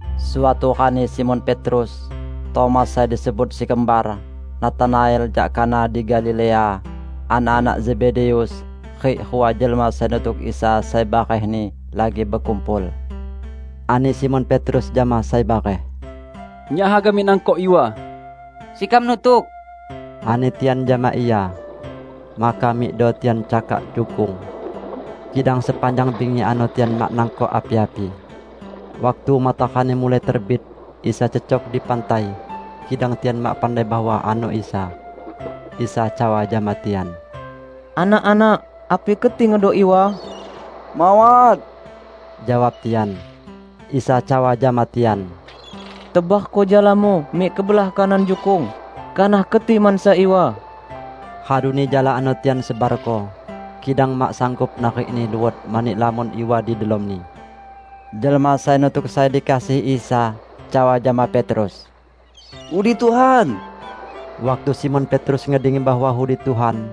Suatu rani Simon Petrus, Tomas sai disebut si Kembar, Natanael jak Kana di Galilea, anak-anak Zebedeus, rik rua jelma sai nutuk Isa sai barehni, lagi bekumpul. Ani Simon Petrus jama sai bareh, "Nyak haga mik nangkok iwa." "Sekam nutuk," ani tian jama ia. Maka mikdo tian cakak jukung. Kidang sepanjang bingi ano tian mak nangkok api-api. Waktu matarani mulai terbit, Isa cecok di pantai, kidang tian mak pandai bahwa ano Isa. Isa cawa jama tian, "Anak-anak, api keti ngedok iwa?" "Mawat," jawab tian. Isa cawa jama tian, "Tebarko jalamu mik kebelah kanan jukung, kanah keti mansa iwa." Raduni jala ano tian sebarko, kidang mak sanggup narikni luot mani lamon iwa di delomni. Jelma sai nutuk sai dikasihi Isa cawa jama Petrus, "Udi Tuhan!" Waktu Simon Petrus ngedengi bahwa udi Tuhan,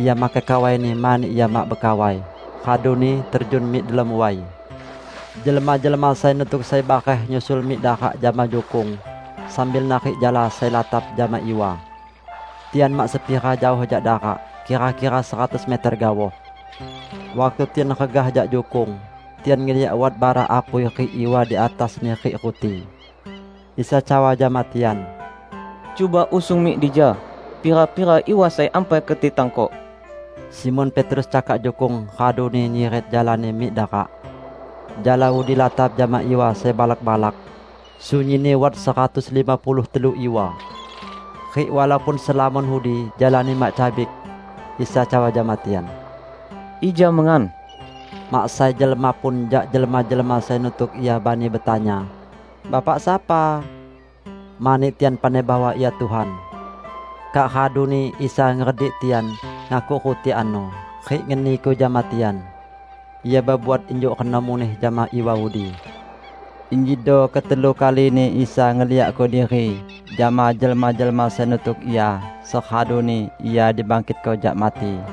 ia makai kawaini (mani ia mak bekawai) raduni terjun mik delom way. Jelma-jelma sai nutuk sai bareh nyusul mik darak jama jukung, sambil narik jala sai latap jama iwa. Tian mak sepira jaoh jak darak, kira-kira seratus meter gaoh. Waktu tian regah jak jukung, tian ngeliak wat bara apui rik iwa di atasni rik ruti. Isa cawa jama tian, "Cuba usung mik dija pira-pira iwa sai ampai keti tangkok." Simon Petrus cakak jukung, raduni nyiret jalani mik darak. Jala udi latap jama iwa sai balak-balak; sunyinni wat seratus lima puluh telu iwa. Rik walaupun selamon udi, jalani mak cabik. Isa cawa jama tian, "Ija mengan." Mak sai jelma pun jak jelma-jelma sai nutuk Ia bani betanya, "Bapak sapa?" Mani tian pandai bahwa Ia Tuhan. Kak raduni Isa ngeredik tian, ngakuk ruti ano, rik ngeniko jama tian. Ia bebuat injuk reno muneh jama iwa udi. Injido ketelu kalini Isa ngeliakko diri jama jelma-jelma sai nutuk Ia seraduni Ia dibangkitko jak mati.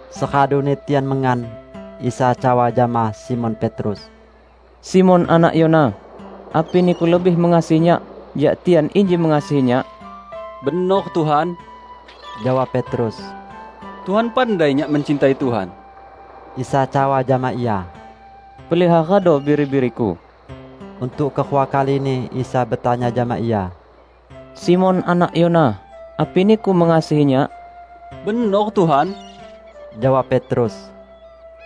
Seraduni tian mengan, Isa cawa jama Simon Petrus, "Simon, anak Yona, api niku lebih mengasihi Nyak jak tian inji mengasihi Nyak?" "Benor, Tuhan," jawab Petrus, "Tuhan pandai nyak mencintai Tuhan." Isa cawa jama ia, "Peliharado biri-biri-Ku." Untuk kerua kalini Isa betanya jama ia, "Simon anak Yona, api niku mengasihi Nyak?" "Benor, Tuhan," jawab Petrus,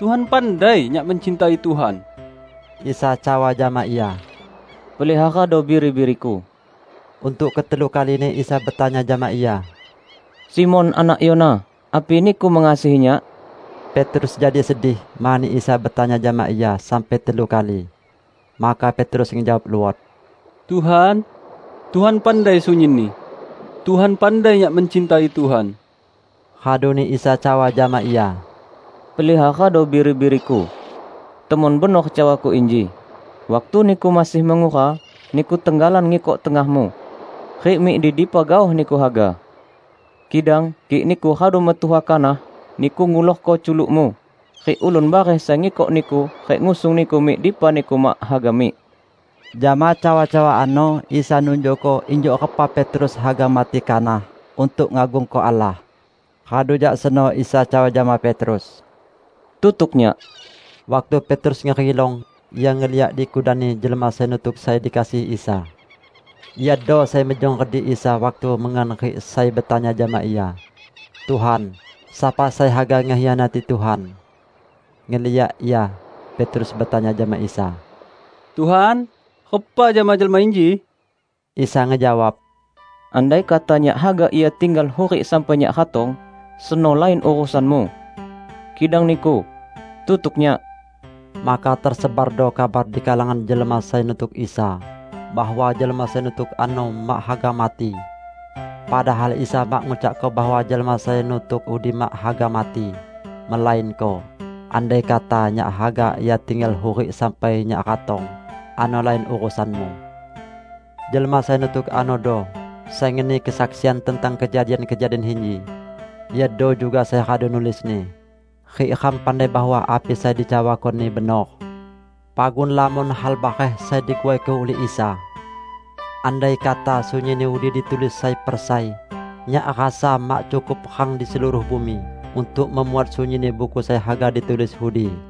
"Tuhan pandai nyak mencintai Tuhan." Isa cawa jama ia, "Peliharado biri-biri-Ku." Untuk ketelu kalini Isa betanya jama ia, "Simon anak Yona, api niku mengasihi Nyak?" Petrus jadi sedih mani Isa betanya jama ia sampai telu kali. Maka Petrus ngejawab luot, "Tuhan, Tuhan pandai sunyinni. Tuhan pandai nyak mencintai Tuhan!" Raduni Isa cawa jama ia, "Peliharado biri-biri-Ku. Temon benor cawa-Ku inji: Waktu niku masih mengura, niku tenggalan ngikok tengahmu, rik mik di dipa gaoh niku haga. Kidang kik niku radu metuha kanah, niku ngulorko culukmu, rik ulun bareh sai ngikok niku rik ngusung niku mik dipa niku mak haga mik." (Jama cawa-cawa ano Isa nunjukko injuk repa Petrus haga mati kanah untuk ngagungko Allah.) Radu jak seno Isa cawa jama Petrus, "Tutuk Nyak!" Waktu Petrus ngerilong, ia ngeliak di kudanni jelma sai nutuk sai dikasihi Isa. (Iado sai mejong redik Isa waktu mengan rik sai betanya jama Ia, "Tuhan, sapa sai haga ngekhianati Tuhan?") Ngeliak ia, Petrus betanya jama Isa, "Tuhan, repa jama jelma inji?" Isa ngejawab, "Andaikata Nyak haga ia tinggal hurik sampai Nyak ratong, seno lain urusanmu. Kidang niku, tutuk Nyak!" Maka tesebardo kabar di kalangan jelma sai nutuk Isa bahwa jelma sai nutuk ano mak haga mati. Padahal Isa mak ngucakko bahwa jelma sai nutuk udi mak haga mati, melainko: "Andaikata Nyak haga ia tinggal hurik sampai Nyak ratong, ano lain urusanmu." Jelma sai nutuk anodo sai ngeni kesaksian tentang kejadian-kejadian inji. Iado juga sai radu nulisni. Rik ram pandai bahwa api sai dicawakoni benor. Pagun lamon hal bareh sai diguaiko ulih Isa. Andaikata sunyinni udi ditulis sai per sai, nyak rasa mak cukup rang di seluruh bumi untuk memuat sunyinni buku sai haga ditulis udi.